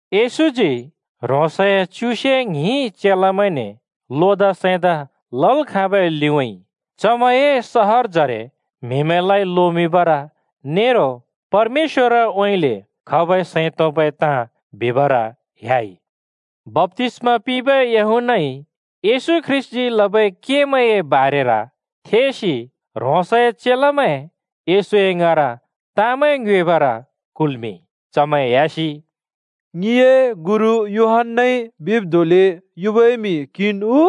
येशूजी ह्रोंसए च्युसे ङ्हिं चेलामैंने लोदा सैंदा लल् खाँबै लिउँइँ चमैंए सहरजरे म्‍हिमैंलाइ लोमिंबर नेरो परमेश्‍वरउँइँले खबै सैं तोंबै ताँ बिबर ह्‍याइ। बप्‍तिस्‍मा पिंबै यूहन्‍नाइ येशू ख्रीष्‍टजी लबै केमैंए बारेर थेसि ह्रोंसए चेलामैं येशू ङाँर ताँमैं ङ्योएबर कुल्‍मिंइ। चमैं ह्‍यासि “ङिए गुरु यूहन्‍नाइ बिब् धोंले युबै म्‍हि क्हिन् उ,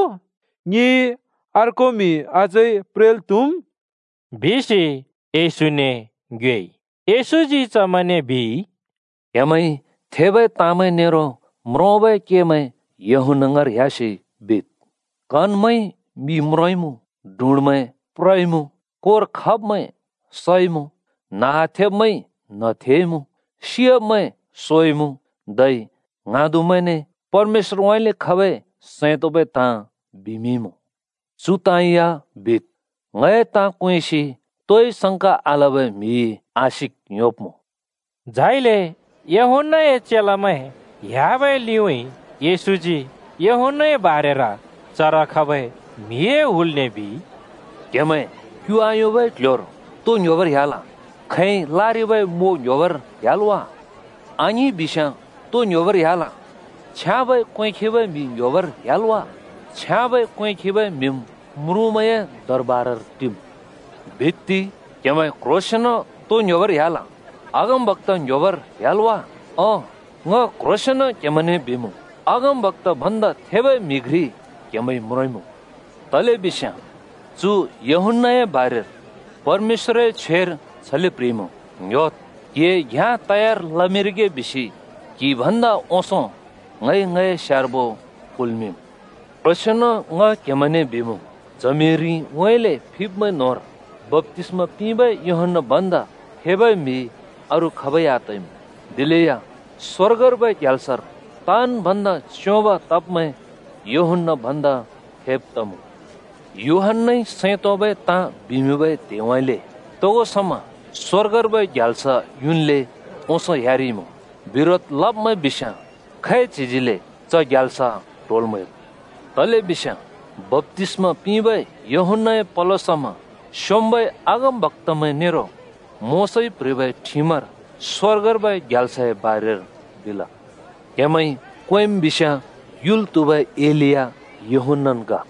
ङिइ अर्को म्‍हि अझै प्रेंल् त्‍हुमुँ?” बिसि येशूने ङ्योएइ। येशूजी चमैंने बिइ, “क्‍हेमैंइ थेबै ताँमैं नेरो म्रोंबै केमैं यूहन्‍ना ङाँर ह्‍यासि बिद्। कनमैंइ मि म्रोंइमुँ, डुँड्मैं प्रइमुँ, कोर खब्‍मैं सइमुँ, न्ह आथेब्मैंइ न्‍ह थेइमुँ, सियाब्‍मैं सोइमुँ धै ङ्हाँदुमैंने परमेश्‍वरउँइँले खबै सैं तोंबै ताँ बिमिंइमुँ। चु ताँ या बिद्, ङए ताँ क्वेंसि तोइ संका आलबै म्‍हिइ आशिक योंब्मुँ।” झाइले यूहन्‍नाए चेलामैं ह्‍याबै लिउँइँ येशूजी यूहन्‍नाए बारेर चर खबै म्‍हिए हुलने बिइ, “क्हेमैं क्यु आयोंबै क्ल्ह्‍योर तो ङ्‌ह्‍योबर ह्‍याल? खैंइ लारिबै म्वो ङ्‌ह्‍योबर ह्‍याल् वा? आङिं बिस्‍याँ, तो ङ्‌ह्‍योबर ह्‍याल? छ्याँबै क्‍वें खिबै म्‍हि ङ्‌ह्‍योबर ह्‍याल् वा? छ्याँबै क्‍वें खिबै म्‍हिम् म्रुँमैंए दरबारर टिम्। बित्ति, क्‍हेमैं क्‍ह्रोंसेंन् तो ङ्‌ह्‍योबर ह्‍याल? अगमबक्‍ता ङ्ह्‍योबर ह्‍याल् वा? ओं, ङ क्ह्रोंसेंन क्हेमैंने बिमुँ, अगमबक्‍ता भन्दा थेबै म्हि घ्रि क्हेमैंइ म्रोंइमुँ, तलेबिस्याँ चु यूहन्‍नाए बारेर परमेश्‍वरए छ्वेर छले प्‍ह्रिइमुँ, ‘ङ्‍ह्‍योद्, क्हिए घ्‍याँ तयार लमिंरिगे बिसि क्हि भन्दा ओंसों ङइ ङए स्यार्बो कुल्मिंम्।’ क्ह्रोंसेंन ङ क्हेमैंने बिमुँ, च्हमिरिउँइँले फिब्मैं न्होंर बप्‍तिस्‍मा पिंबै यूहन्‍ना भन्दा थेबै म्‍हि अरू खाबै आतइमुँ। दिलेया स्वर्गर्बै ग्याल्सर ताँन् भन्दा च्योंब तब्मैं यूहन्‍ना भन्दा थेब तमुँ। यूहन्‍नाइ सैं तोंबै ताँ बिमिंबै त्हेउँइँले तोगो समा स्वर्गर्बै ग्याल्स युन्ले ओंसों ह्‍यारिइमुँ। बिरोध लब्मैं बिस्याँ खैच्हिजिले च ग्याल्स ट्होल् म्हैम्। तलेबिस्याँ बप्‍तिस्मा पिंबै यूहन्‍नाए पलो समा स्‍योंम्‍बै अगमबक्‍तामैं नेरो मोशाइ प्‍ह्रिबै ठिमर स्‍वर्गर्बै ग्याल्सए बारेर बिल। क्हेमैंइ क्वेंम् बिस्याँ, युल् त्हुबै एलिया यूहन्‍नान् ग।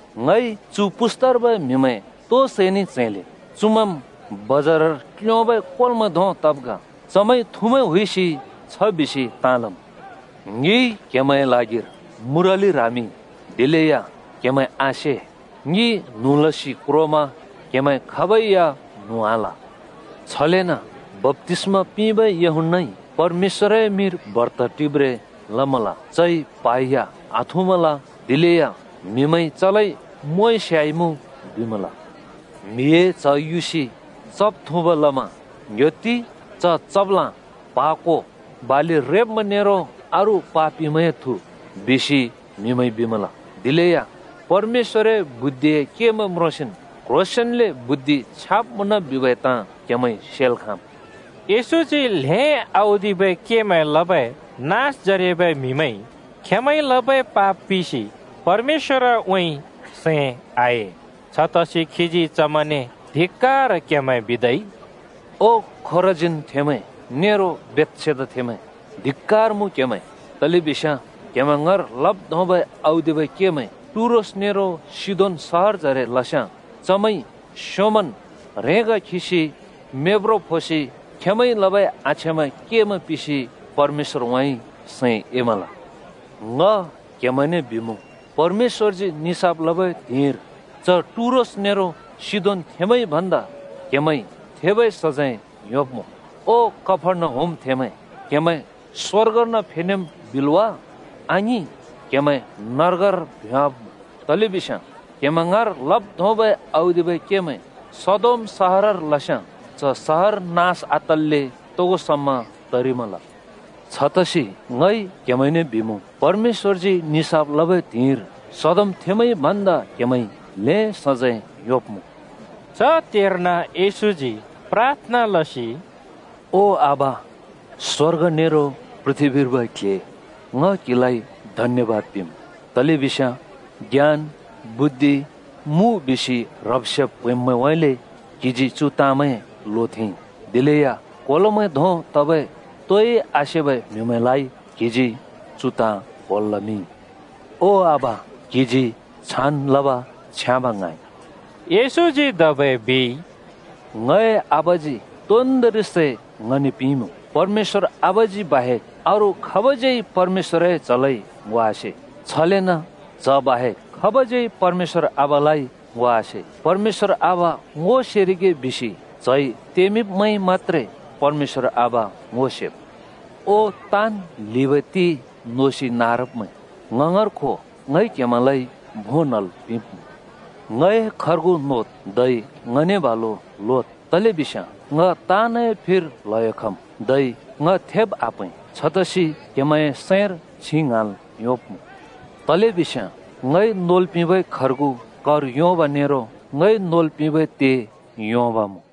“ङइ चु पुस्तार्बै म्‍हिमैं तो सैने च्हैंले? चुमैंम् बजारर क्‍ल्योंबै कोलोमैं धों तब् ग। चमैंइ थुमैं हुइसि छ बिसि ताँ लम्, ‘ङिइ क्‍हेमैंए ल्हागिर मुरलि ह्रामिंइ, दिलेया क्‍हेमैं आसे। ङि न्हुँ लसि क्रोमा क्‍हेमैं खाबै या न्हुँ आल।’ छलेन बप्‍तिस्‍मा पिंबै यूहन्‍नाइ परमेश्‍वरए मिंर बर्त टिब्रें लमल, चइ प्हा या आथुँमल। दिलेया म्‍हिमैंइ ‘चलाइ मोंइ स्‍याइमुँ!’ बिमल। म्हिए च्ह युसि चब् थुँब् लमा ‘ङ्‍ह्‍योत्ति, च चब्लाँ, प्हा को, बालि रेब्‍मैं नेरो अरू पापिमैंए थु!’ बिसि म्‍हिमैंइ बिमल। दिलेया परमेश्‍वरए बुद्धिए केमैं म्रोंसिन् क्ह्रोसेंन्ले बुद्धि छ्याँब् मुँन बिबै ताँ क्हेमैंइ सेल् खाँम्।” येशूजी ल्‍हें औदिबै केमैं लबै नाँसजरेबै म्हिमैंइ खेंमैंइ लबै पाप पिसि परमेश्‍वरउँइँ सैं आए। छतसि खीजी चमैंने धिक्‍कार क्हेमैं बिदै। “ओ खोराजीनथेंमैं नेरो बेथसेदाथेंमैं! धिक्‍कार मुँ क्‍हेमैं, तलेबिस्याँ क्हेमैं ङाँर लब् धोंबै औदिबै केमैं टुरोस नेरो सिदोन सहरजरे लस्याँ चमैंइ स्योंमन् ह्रेंगा खिसि मेब्ब्रो फोसि खेंमैंइ लबै आछ्याँबै केमैं पिसि परमेश्‍वरउँइँ सैं एमल। ङ क्हेमैंने बिमुँ, परमेश्‍वरजी निसाफ लबै त्हिंइर च टुरोस नेरो सिदोनथेमैंइ भन्दा क्‍हेमैंइ थेबै सजैं योंब्मुँ ओ कफर्नहुमथेंमैं, क्‍हेमैं स्वर्गर्न फेनेम् बिल् वा? आङिं! क्‍हेमैं नर्गर्न भ्‍योंवाब्‍मुँ। तलेबिस्याँ क्‍हेमैं ङाँर लब् धोंबै औदिबै केमैं सदोम सहरर लस्‍याँ च सहर नास आतल्‍ले तोगो समा तरिमल। छतसि ङ क्हेमैंने बिमुँ, परमेश्‍वरजी निसाफ लबै त्हिंइर सदोमथेंमैंइ भन्दा क्‍हेमैंइ ल्हें सजैं योंब्मुँ।” च त्हेर्न येशूजी प्राथना लसि “ओ आबा, स्वर्ग नेरो पृथ्‍बीर्बै क्‍ल्‍हे, ङ क्‍हिलाइ धन्‍यबाद पिंम्, तलेबिस्याँ ज्ञान बुद्धि मुँ बिसि ह्रब्-सेब् प्हैंब्मैंउँइँले क्‍हिजी चु ताँमैं लोथेंइ। दिलेया कोलोमैं धों तबै तोइ आसेबै म्‍हिमैंलाइ क्हिजी चु ताँ क्‍होल् लमिंइ। ओ आबा, क्हिजी छान् लब छ्याँब ङ्हाँइ।” येशूजी धबै बिइ, “ङए आबाजी तोन्दोंरि सै ङने पिंइमुँ। परमेश्‍वर आबाजी बाहेक अरू खाबज्‍यै परमेश्‍वरए च्‍हलाइ ङो आसे। छलेन च्ह बाहेक खाबज्यै परमेश्‍वर आबालाइ ङो आसे। ‘परमेश्‍वर आबा ङो सेरिगे’ बिसि च्हजी तेंमिंब्मैंइ मत्‍त्रे परमेश्‍वर आबा ङो सेमुँ। “ओ ताँन् ल्हिबै ते नोसि नारब्मैं, ङ ङाँर खो, ङइ क्‍हेमैंलाइ भों न्‍हल् पिंब्मुँ। ङए खर्गु नोद्, धै ङने बालु लोद्, तलेबिस्याँ ङ ताँनए फिर ल्हयो खम्, धै ङ थेब् आप्‍हैं। छतसि क्‍हेमैंए सैंर छिं ङ्हाँल् योंब्मुँ। तलेबिस्याँ ङइ नोल् पिंबै खर्गु कर योंब नेरो ङइ नोल् पिंबै ते योंब्मुँ।”